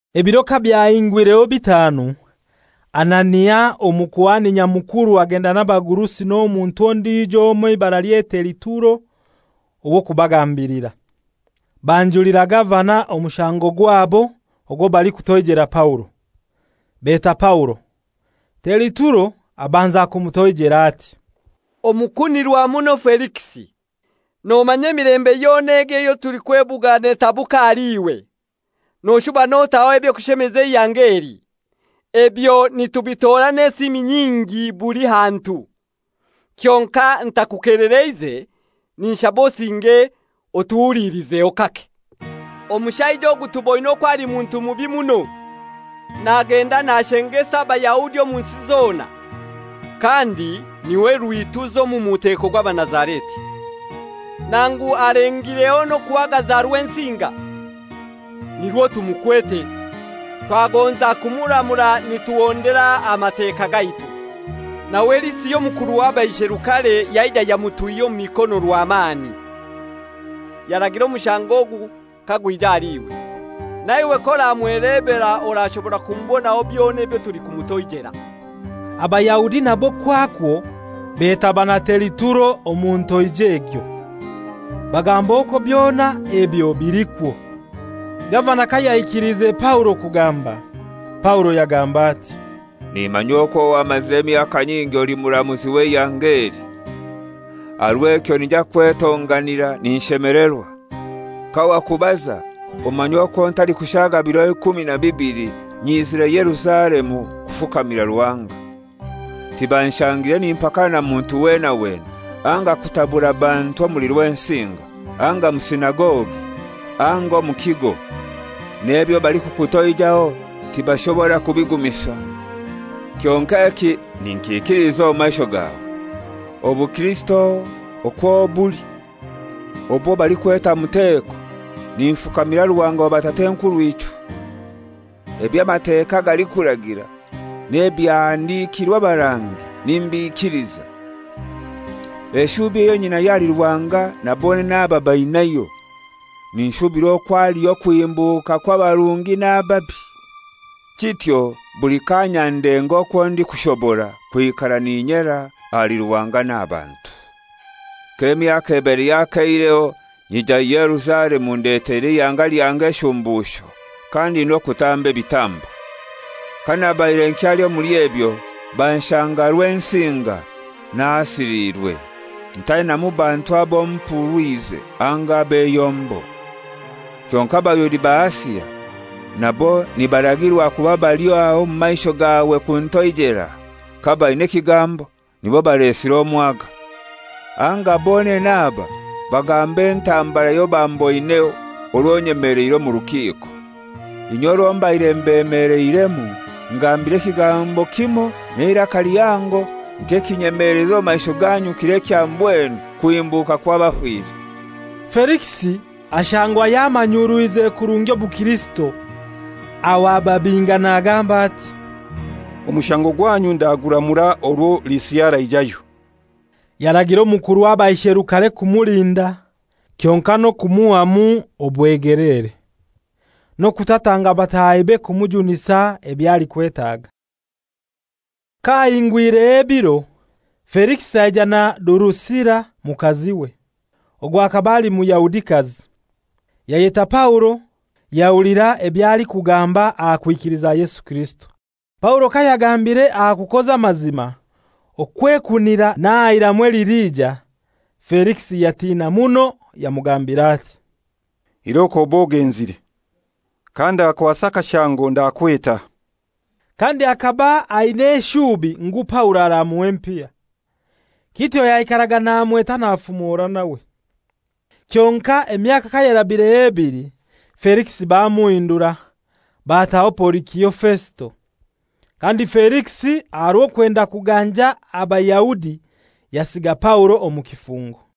Ebiro kabyahingwireho bitanu, Anania Omukuhani Nyamukuru agenda n'abagurusi n'omuntu ondijo omoi eibaralye Teritulo ow'okubagambilira. Banjulira gavana omushango gwabo ogwo balikutoijela Paulo. Beta Paulo, Teritulo abanza kumutoijera ati: «Omukunirwa muno Felikisi, nomanya emilembe yona egi eyo tulikwebuga netabuka ahali iwe. Noshuba notaho eby'okushemeza eihanga eli. Ebyo nitubitora n'esiimi nyingi buli hantu. Kyonkai ntakukelereize ninshaba osinge otuhulilizeho kake. Omushaija ogu tuboine okwo ali muntu mubi muno. Nagenda nashengesa Abayahudi omu nsi zona, kandi n'iwe rwituza omu muteko gw'Abanazareti. Nangu alengireho n'okuhagaza Rwensinga, nirwo tumukwete. [Twagonza kumuramura nituhondera Amateka gaitu, nawe Lisia omukuru w'abaisherukare yaija yamutwihya omu mikono rwamani. Yaragira omushango ogu kagwija ahali iwe.] Naiwe k'oramwelebera orashobora kumubonaho byona ebyo tulikumutoijela.» Abayahudi nabo kwakwo betaba na Teritulo omu ntoija egyo, bagamba okwo byona ebyo bilikwo. Gavana kayaikiliize Paulo kugamba, Paulo yagamba ati, «Nimanya okwo wamazire emyaka nyingi oli muramuzi w'eihanga eli. Aha rw'ekyo ninyija kwetonganira ninshemelerwa. Kawakubaza omanya okwo ntalikushaga biro nyizire Yerusalemu kufukamira Ruhanga. 12Tibanshangire nimpakana na muntu weena weena, anga kutabura bantu omuli Rwensinga, anga omu sinagogi, anga omu kigo. N'ebyo balikukutoijaho tibashobora kubigumisa. Kyonkai eki ninkiikiliza omu maisho gawe. Obukirisito okwo buli obwo balikweta muteko, ninfukamira Ruhanga wa batat'enkurw'ichwe. Eby'Amateka galikuragira n'ebyahandikirwe abarangi, nimbikiliza. Eshubi eyo nyinayo ahali Ruhanga na bonene aba bainayo, ninshubira okwo haliyo okuhimbuka kw'abarungi n'ababi. Kityo buli kaanya ndenga okwo ndikushobora kwikara n'inyera ahali Ruhanga n'aha bantu. «K'emyaka ebaire yakeireho nyija Yerusalemu ndeteire eihanga lyange eshumbusho, kandi n'okutamba ebitambo. Kanabaire nkyali omuli ebyo banshanga Rwensinga nahasiliirwe, ntainamu bantu abo mpurwize, anga ab'eyombo. Kyonkai Abayahudi ba Asia, nabo nibaragirwa kuba bali aha omu maisho gawe kuntoijela, kabaina ekigambo, nibo balesire omwaga. Anga bonene aba bagambe entambara yobamboineho orwo nyemeleire omu rukiiko. Inye orwo mbaire mbemeleiremu ngambire ekigambo kimoi n'eiraka lihango nti, ‹Ekinyemeleize omu maisho ganyu kiro ekya mbwenu kuhimbuka kw'abafire.›» Felikisi ashangwa yamanyurwize kurungi obukirisito, aho ababinga nagamba ati, «Omushango gwanyu ndaguramura orwo Lisia araijayo.» Yaragira omukuru w'abaisherukare kumulinda kyonkai n'okumuhamu obwegeleere, n'okutatanga batahibe kumujunisa ebyo alikwetaga. Kahahingwireho ebiro, Felikisi aija na Durusila mukaziwe, ogwo akaba ali Muyahudikazi. Yayeta Paulo yahulira eby'alikugamba aha kwikiliza Yesu Kirisito. Paulo kayagambire aha kukoza amazima, okwekunira, n'aha iramu eliliija, Felikisi yatina muno, yamugambira ati, «Iroko obe ogenzire! Kandakwasa akashango ndakweta.» Kandi akaba aina eshubi ngu Paulo aramuha empiya. Kityo yaikaraga namweta nafumora nawe. Kyonkai emyaka kayarabireho ebili Felikisi bamuhindura, bataho Porikio Fesito. Kandi Felikisi aha rw'okwenda kuganja Abayahudi yasiga Paulo omu kifungo.